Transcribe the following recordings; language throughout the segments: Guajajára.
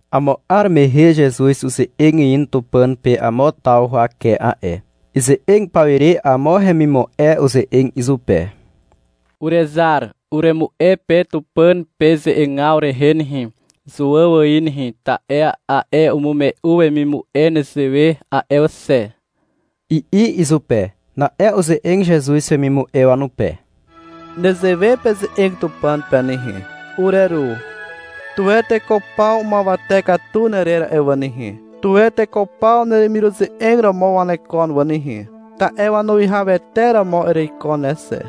Amo 'ar mehe Zezuz uze'eg in Tupàn pe amo taw huwake a'e. Ize'eg pawire amo hemimu'e uze'eg izupe. — Urezar, uremu'e pe Tupàn pe ze'egaw rehe nehe, Zuàw ài nehe, ta'e a'e umu'e wemimu'e nezewe a'e xe, i'i izupe. Na'e uze'eg Zezuz wemimu'e wanupe. — Nezewe peze'eg Tupàn pe nehe. — Ureru. Tuwe teko paw umuawate katu nerer a'e wà nehe. Tuwe teko paw neremiruze'eg romo wanekon wà nehe, ta'e wanuwihawete romo ereiko ne xe.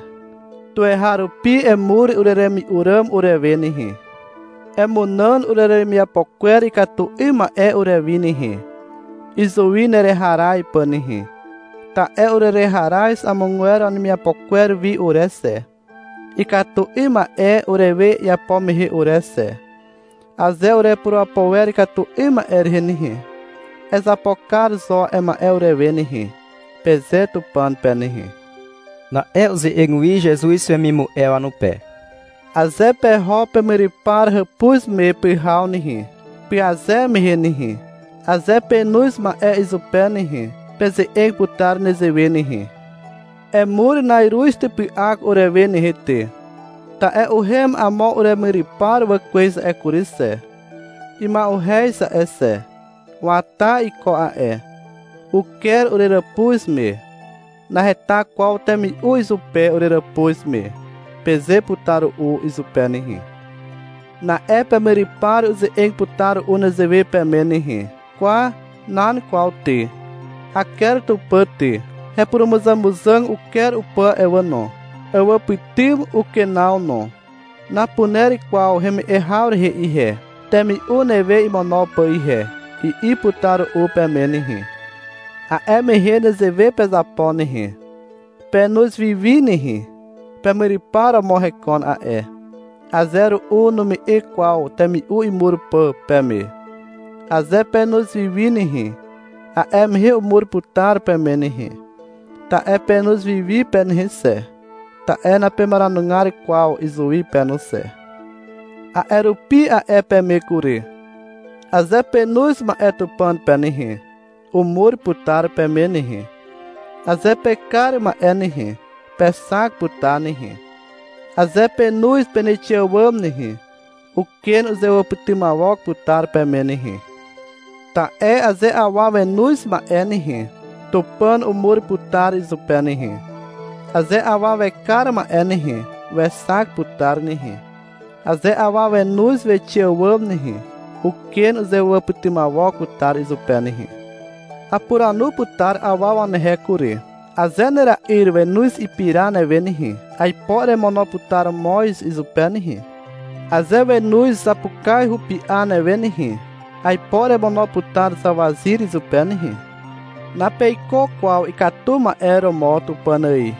Tuweharupi emur ureremi'u ràm urewe nehe. Emunàn ureremiapo kwer ikatu 'ym ma'e urewi nehe, izuwi nereharaz pà nehe. Ta'e urereharaz amogwer wanemiapo kwer wi ure xe, ikatu 'ym ma'e urewe iapo mehe ure xe. Aze urepurapo wer ikatu 'ym ma'e rehe nehe, ezapo kar zo a'e ma'e urewe nehe, peze Tupàn pe nehe. Na'e uze'eg wi Zezuz wemimu'e wanupe. — Aze peho pemyrypar hàpuz me pyhaw nehe, pyaze mehe nehe, aze penoz ma'e izupe nehe, peze'eg putar nezewe nehe. — Emur na'iruz typy'ak urewe nehe ty, ta'e uhem amo uremyrypar wà kwez a'e kury xe. Ima'uhez a'e xe. Wata iko a'e. Uker ureràpuz me. Naheta kwaw temi'u izupe ureràpuz me, peze putar ru'u izupe nehe. Na'e pemyrypar uze'eg putar ru'u nezewe peme nehe. — Kwa, nan kwaw ty, aker tupà ty, hepurumuzàmuzàg uker upà a'e wà no. Awàpytym ukenaw no. Napuner kwaw heme'e haw rehe ihe, temi'u newe imono pà ihe, i'i putar ru'u peme nehe. A'e mehe nezewe pezapo nehe. Penoz wiwi nehe. Pemyrypar romo hekon a'e. Aze ru'u nume'e kwaw temi'u imur pà peme. Aze penoz wiwi nehe, a'e mehe umur putar peme nehe, ta'e penoz wiwi pe nehe xe, ta'e napemaranugar kwaw izuwi pe no xe. A'e rupi a'e peme kury. Aze penoz ma'e Tupàn pe nehe, umur putar peme nehe. Aze pekar ma'e nehe, pexak putar nehe. Aze penoz peneixe àwàm nehe, uken uzewàpytymawok putar peme nehe. Ta'e aze awa wenoz ma'e nehe, Tupàn umur putar izupe nehe. Aze awa wekar ma'e nehe, wexak putar nehe. Aze awa wenoz wixe àwàm nehe, uken uzewàpytymawok putar izupe nehe. Apuranu putar awa wanehe kury. Aze nera'yr wenoz ipira newe nehe, aipo eremono putar moz izupe nehe. Aze wenoz zapukaz hupi'a newe nehe, aipo eremono putar zawazyr izupe nehe. Napeiko kwaw ikatu ma'e romo Tupàn ài.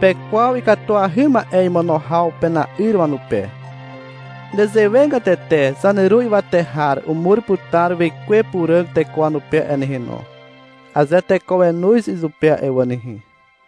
Pekwaw ikatuahy ma'e imono haw pena'yr wanupe. Nezewegatete zaneru ywate har umur putar Wekwe Puràg teko wanupe a'e nehe no, aze teko wenoz izupe a'e wà nehe.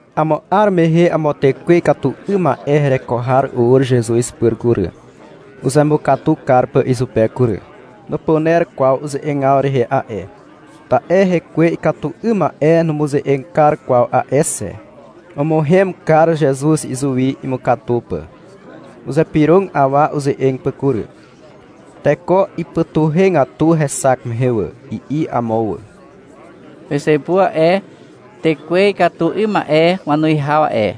Amo 'ar mehe amo tekwe ikatu 'ym ma'e hereko har ur Zezuz pyr kury, uzemukatu kar pà izupe kury. Nupuner kwaw uze'egaw rehe a'e, ta'e hekwe ikatu 'ym ma'e numuze'eg kar kwaw a'e xe. Umuhem kar Zezuz izuwi, imukatu pà. Uzypyrog awa uze'eg pà kury. Teko ipytuhegatu hexak mehe wà. I'i amo wà. — Pezepu a'e, tekwe ikatu 'ym ma'e wanuwihaw a'e,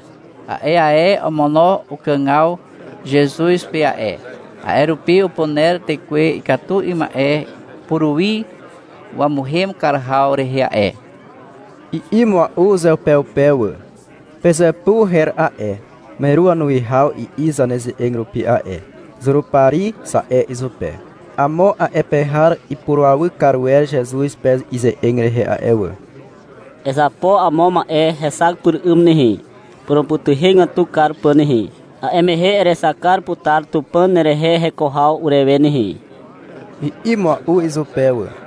a'e ae omono ukàgaw Zezuz pe a'e. A'e rupi upuner tekwe ikatu 'ym ma'e puruwi wamuhem kar haw rehe a'e, i'i mua'u uzeupeupe wà. (Pezepu her a'e, meru wanuwihaw i'i zaneze'eg rupi a'e. — Zurupari, za'e izupe.) Amo a'e pe har ipurawy kar wer Zezuz pe ize'eg rehe a'e wà. — Ezapo amo ma'e hexak pyr 'ym nehe, purumupytuhegatu kar pà nehe, a'e mehe erexak kar putar Tupàn nerehe heko haw urewe nehe, i'i mua'u izupe wà.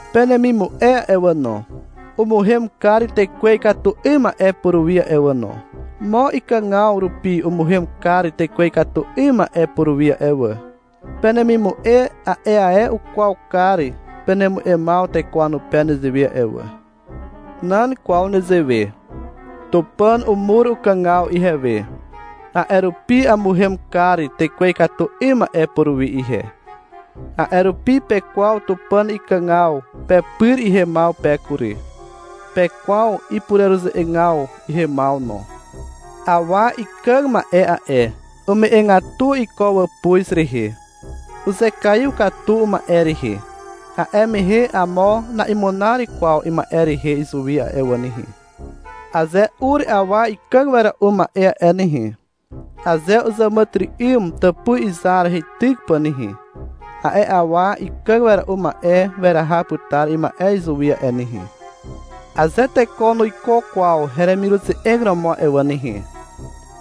Penemimu'e a'e wà no, umuhem kar tekwe ikatu 'ym ma'e puruwi a'e wà no. Mo ikàgaw rupi umuhem kar tekwe ikatu 'ym ma'e puruwi a'e wà. Penemimu'e a'e ae ukwaw kar penemu'emaw teko wanupe nezewe a'e wà. Nan kwaw nezewe. Tupàn umur ukàgaw ihewe, a'e rupi amuhem kar tekwe ikatu 'ym ma'e puruwi ihe. A'e rupi pekwaw Tupàn ikàgaw pepyr ihemaw pe kury. Pekwaw ipureruze'egaw ihemaw no. Awa ikàg ma'e a'e, ume'egatu iko wàpuz rehe, uzekaiw katu uma'e rehe. A'e mehe amo na'imunar kwaw ima'e rehe izuwi a'e wà nehe. Aze ur awa ikàg wera'u ma'e a'e nehe, aze uzàmàtyry'ym tàpuz izar heityk pà nehe, a'e awa ikàg wera'u ma'e weraha putar ima'e izuwi a'e nehe. Aze teko nuiko kwaw heremiruze'eg romo a'e wà nehe,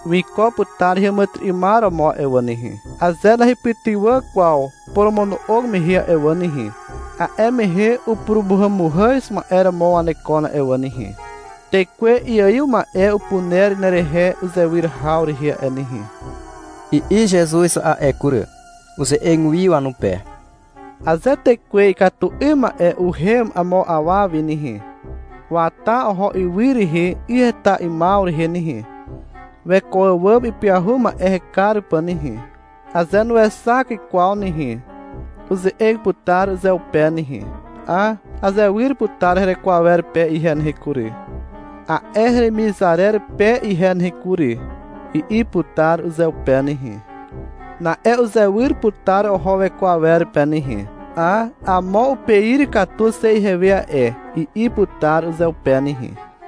wiko heàmàtyry'ymar romo a'e wà nehe. Aze nahepytywà kwaw poromono'og mehe a'e wà nehe, a'e mehe upurumuhàmuhàz ma'e romo wanekon a'e wà nehe. — Tekwe iaiw ma'e upuner nerehe uzewyr haw rehe a'e nehe, i'i Zezuz a'e kury. Uze'eg wi wanupe. — Aze tekwe ikatu 'ym ma'e uhem amo awa wi nehe, wata oho ywy rehe 'y heta 'ymaw rehe nehe, weko àwàm ipyahu ma'e hekar pà nehe. Aze nuexak kwaw nehe, uze'eg putar uzeupe nehe, — Hà, azewyr putar hereko awer pe ihe nehe kury, a'e heremizarer pe ihe nehe kury, i'i putar uzeupe nehe. Na'e uzewyr putar oho weko awer pe nehe. — Hà, amo upeir katu xe ihewe a'e, i'i putar uzeupe nehe.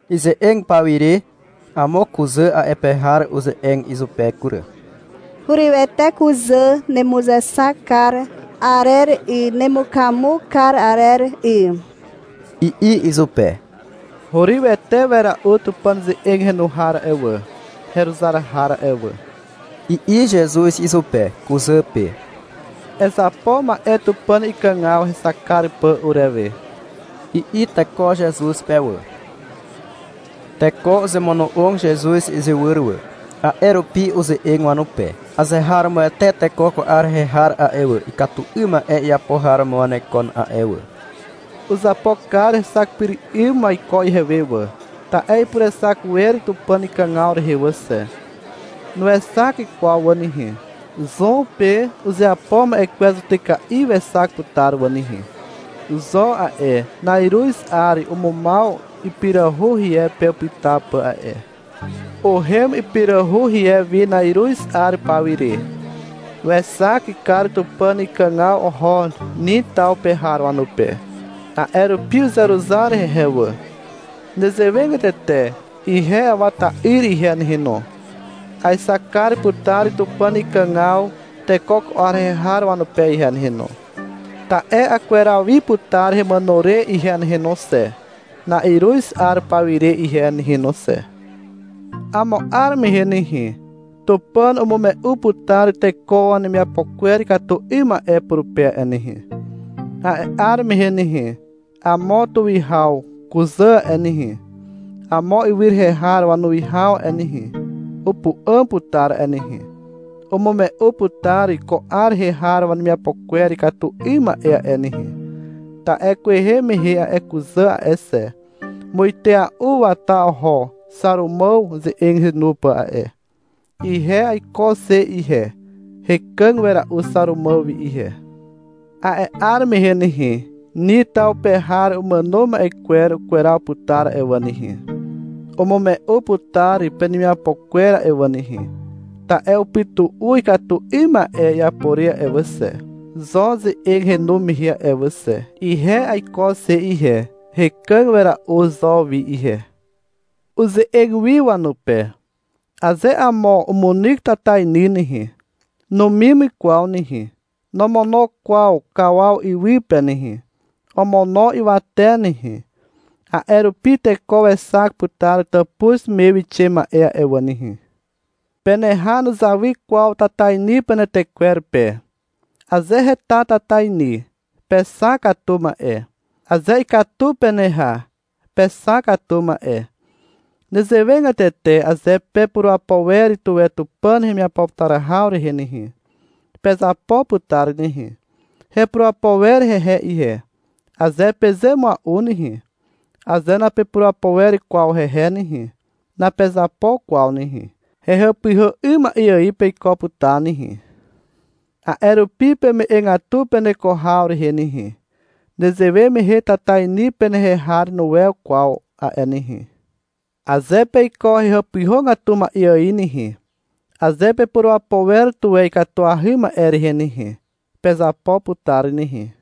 Ize'eg pawire amo kuzà a'e pe har uze'eg izupe kury. — Hurywete kuzà nemuzexak kar arer 'y, nemukamu kar arer 'y, i'i izupe. — Hurywete wera'u Tupàn ze'eg henu har a'e wà, heruzar har a'e wà, i'i Zezuz izupe, kuzà pe. — Ezapo ma'e Tupàn ikàgaw hexak kar pà urewe, i'i teko Zezuz pe wà. Teko uzemono'og Zezuz izywyr wà. A'e rupi uze'eg wanupe. — Azeharomoete teko ko 'ar rehe har a'e wà, ikatu 'ym ma'e iapo har romo wanekon a'e wà. Uzapo kar hexak pyr 'ym waiko ihewe wà, ta'e ipurexak wer Tupàn ikàgaw rehe wà xe. Nuexak kwaw wà nehe. Zon pe uzeapo ma'e kwer zutyka'i wexak putar wà nehe. Zon a'e, na'iruz 'ar umumaw ipirahu rie pe upyta pà a'e. Uhem ipirahu rie wi na'iruz 'ar paw ire. Wexak kar Tupàn ikàgaw oho Nin taw pe har wanupe. A'e rupi uzeruzar hehe wà. Nezewegatete ihe Awa ta'yr ihe nehe no, aexak kar putar Tupàn ikàgaw teko ko 'ar rehe har wanupe ihe nehe no. Ta'e akweraw wi putar hemàno re ihe nehe no xe, na'iruz 'ar paw ire ihe nehe no xe. Amo 'ar mehe nehe, Tupàn umume'u putar teko wanemiapo kwer ikatu 'ym ma'e purupe a'e nehe. A'e 'ar mehe nehe, amo tuwihaw kuzà a'e nehe, amo ywy rehe har wanuwihaw a'e nehe, upu'àm putar a'e nehe, umume'u putar ko 'ar rehe har wanemiapo kwer ikatu 'ym ma'e a'e nehe. Ta'e kwehe mehe a'e kuzà a'e xe, muitea'u wata oho Xàrumàw ze'eg henu pà a'e. Ihe aiko xe ihe. Hekàg wera'u Xàrumàw wi ihe. A'e 'ar mehe nehe, Nin taw pe har umàno ma'e kwer ukweraw putar a'e wà nehe, umume'u putar penemiapo kwer a'e wà nehe, ta'e upytu'u ikatu 'ym ma'e iapo re a'e wà xe, Zon ze'eg henu mehe a'e wà xe. Ihe aiko xe ihe. Hekàg wera'u Zon wi ihe. Uze'eg wi wanupe. — Aze amo umunyk tatainy nehe, numim kwaw nehe, nomono kwaw kawaw iwy pe nehe. Omono ywate nehe, a'e rupi teko wexak putar tàpuz me wixe ma'e a'e wà nehe. Peneha nuzawy kwaw tatainy penetekwer pe. Aze heta tatainy, pexak katu ma'e. Aze ikatu peneha, pexak katu ma'e. Nezewegatete aze pepurapo wer tuwe Tupàn hemiapo putar haw rehe nehe, pezapo putar nehe. — Hepurapo wer hehe ihe, aze peze mua'u nehe, aze napepurapo wer kwaw hehe nehe, napezapo kwaw nehe. Hehàpyhà 'ym ma'e ài peiko putar nehe. A'e rupi peme'egatu peneko haw rehe nehe. Nezewe mehe tatainy penehe har nuwew kwaw a'e nehe. Aze peiko hehàpyhàgatu ma'e ài nehe, aze pepurapo wer tuwe ikatuahy ma'e rehe nehe, pezapo putar nehe.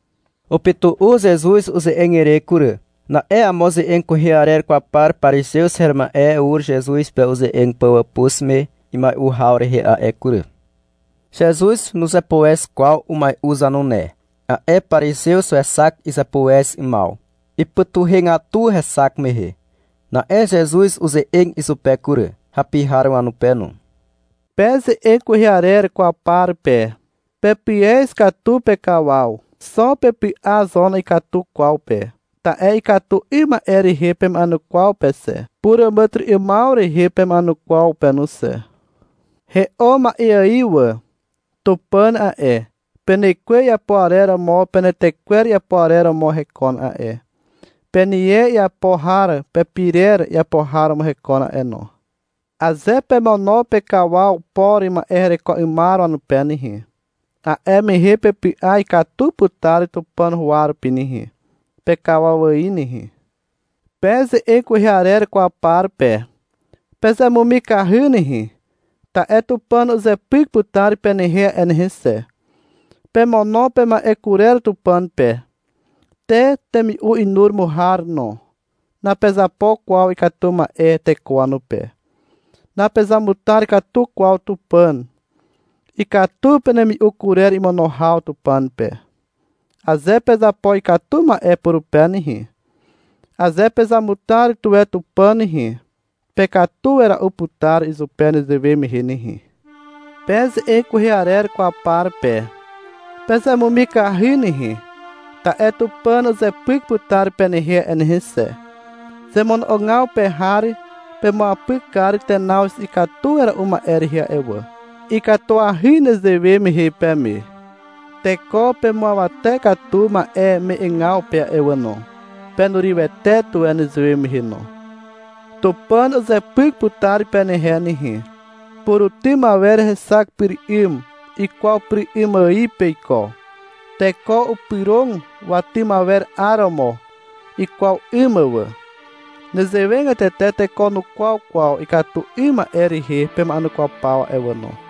Upytu'u Zezuz uze'eg ire kury. Na'e amo ze'eg kwehe arer kwaw par parizew her ma'e ur Zezuz pe uze'eg pà wàpuz me imai'u haw rehe a'e kury. Zezuz nuzepuez kwaw umai'u zanune. A'e parizew wexak izepuez 'ymaw. Ipytuhegatu hexak mehe. Na'e Zezuz uze'eg izupe kury, (hapi har wanupe no). — Pe ze'eg kwehe arer kwaw par pe, pepyez katu pekawaw. Xo pepy'a zo na'ikatu kwaw pe. Ta'e ikatu 'ym ma'e rehe pema'enukwaw pe xe, puràmàtyry'ymaw rehe pema'enukwaw pe no xe. He'o ma'e ài wà. Tupàn a'e, penekwe iapo arer romo penetekwer iapo arer romo hekon a'e. Penie iapo har pepirer iapo har romo hekon a'e no. Aze pemono pekawaw por ma'e hereko 'ymar wanupe nehe, a'e mehe pepy'a ikatu putar Tupàn huwa rupi nehe, pekawaw ài nehe. Pe ze'eg kwehe arer kwaw par pe. Pezemumikahy nehe, ta'e Tupàn uzepyk putar penehe a'e nehe xe. Pemono pema'e kurer Tupàn pe, te temi'u inuromo har no. Napezapo kwaw ikatu ma'e teko wanupe. Napezamutar katu kwaw Tupàn. Ikatu penemi'u kurer imono haw Tupàn pe. Aze pezapo ikatu ma'e purupe nehe, aze pezamutar tuwe Tupàn nehe, pekatu wera'u putar izupe nezewe mehe nehe. Pe ze'eg kwehe arer kwaw par pe, pezemumikahy nehe, ta'e Tupàn uzepyk putar penehe a'e nehe xe. Zemono'ogaw pe har pemuapyk kar tenaw ikatu wera'u ma'e rehe a'e wà. Ikatuahy nezewe mehe peme. Teko pemuawate katu ma'e me'egaw pe a'e wà no. Penurywete tuwe nezewe mehe no. Tupàn uzepyk putar penehe nehe. Purutym awer hexak pyr 'ym ikwaw pyr 'ym ài peiko. Teko upyrog watym awer 'aromo ikwaw 'ym mà wà. Nezewegatete teko nukwaw kwaw ikatu 'ym ma'e rehe pema'enukwaw paw a'e wà no.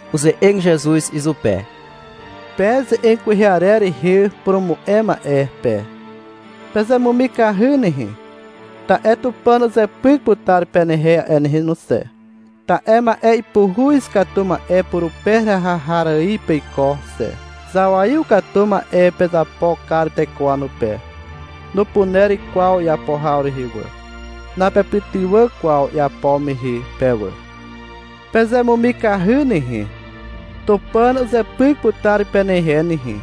Uze'eg Zezuz izupe. — Pe ze'eg kwehe arer rehe purumu'e ma'e pe, pezemumikahy nehe, ta'e Tupàn uzepyk putar penehe a'e nehe no xe, ta'e ma'e ipuhuz katu ma'e purupe heraha kar har ài peiko xe. Zawaiw katu ma'e pezapo kar teko wanupe. Nupuner kwaw iapo haw rehe wà. Napepytywà kwaw iapo mehe pe wà. Pezemumikahy nehe. Tupàn uzepyk putar penehe nehe.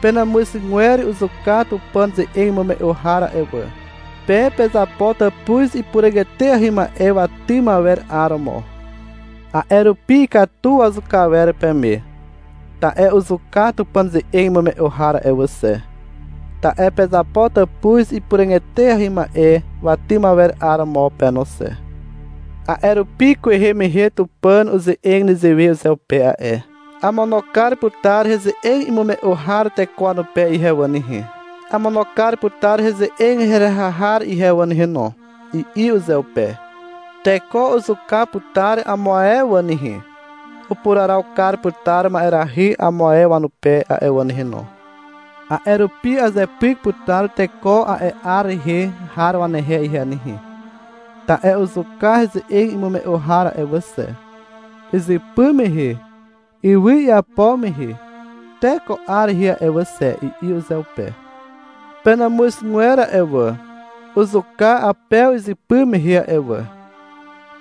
Penàmuzgwer uzuka Tupàn ze'eg imume'u har a'e wà. Pe pezapo tàpuz ipuràg eteahy ma'e watym awer 'aromo. A'e rupi ikatu wazuka awer peme, ta'e uzuka Tupàn ze'eg imume'u har a'e wà xe, ta'e pezapo tàpuz ipuràg eteahy ma'e watym awer 'aromo pe no xe. A'e rupi kwehe mehe Tupàn uze'eg nezewe uzeupe a'e. — Amono kar putar heze'eg imume'u har a'e teko wanupe ihe wà nehe, amono kar putar heze'eg heraha har ihe wà nehe no, i'i uzeupe. — Teko uzuka putar amo a'e wà nehe, upuraraw kar putar ma'erahy amo ae wanupe a'e wà nehe no. A'e rupi azepyk putar teko a'e 'ar rehe har wanehe ihe nehe, ta'e uzuka heze'eg imume'u har a'e wà xe, izypy mehe, ywy iapo mehe te ko 'ar rehe a'e wà xe, i'i uzeupe. Penàmuzgwer a'e wà, uzuka Apew izypy mehe a'e wà.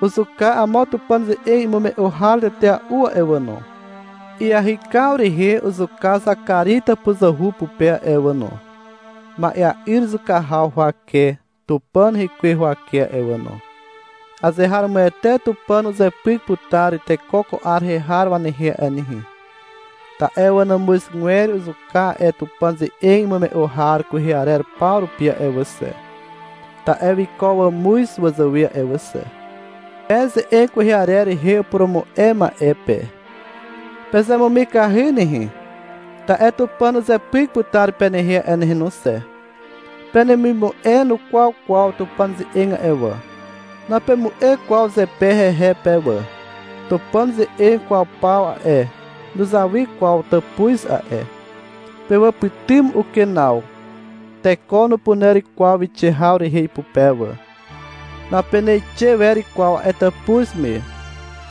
Uzuka amo Tupàn ze'eg imume'u har tetea'u a'e wà no. Iahykaw rehe uzuka Zakari tàpuzuhu pupe a'e wà no, ma'ea'yr zuka haw huwake Tupàn rekwe huwake a'e wà no. Azeharomoete Tupàn uzepyk putar teko ko 'ar rehe har wanehe a'e nehe, ta'e wanàmuzgwer uzuka a'e Tupàn ze'eg imume'u har kwehe arer paw rupi a'e wà xe, (ta'e wiko wàmuz wazàwe a'e wà xe). Pe ze'eg kwehe arer rehe upurumu'e ma'e pe. Pezemumikahy nehe, ta'e Tupàn uzepyk putar penehe a'e nehe no xe. Penemimu'e nukwaw kwaw Tupàn ze'eg a'e wà. Napemu'e kwaw zepe hehe pe wà. Tupàn ze'eg kwaw paw a'e, nuzawy kwaw tàpuz a'e. Pewàpytym ukenaw. Teko nupuner kwaw wixe haw rehe ipupe wà. Napeneixe wer kwaw a'e tàpuz me.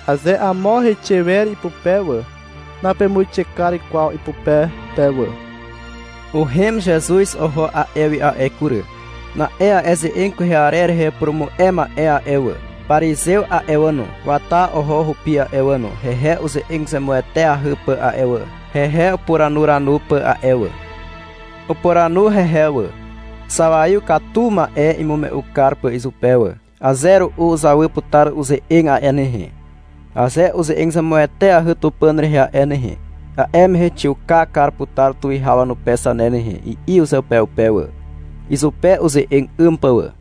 Aze amo heixe wer ipupe wà, napemuixe kar kwaw ipupe pe wà. Uhem Zezuz oho a'e wi a'e kury. Na'e a'e ze'eg kwehe arer rehe upurumu'e ma'e a'e wà, parizew a'e wà no, wata oho hupi a'e wà no, hehe uze'eg zemueteahy pà a'e wà, hehe upuranuranu pà a'e wà. Upuranu hehe wà, zawaiw katu ma'e imume'u kar pà izupe wà. — Aze ru'u uzawy putar uze'eg a'e nehe. Aze uze'eg zemueteahy Tupàn rehe a'e nehe, a'e mehe xiuka kar putar tuwihaw wanupe zane nehe, i'i uzeupeupe wà, izupe uze'eg 'ym pà wà.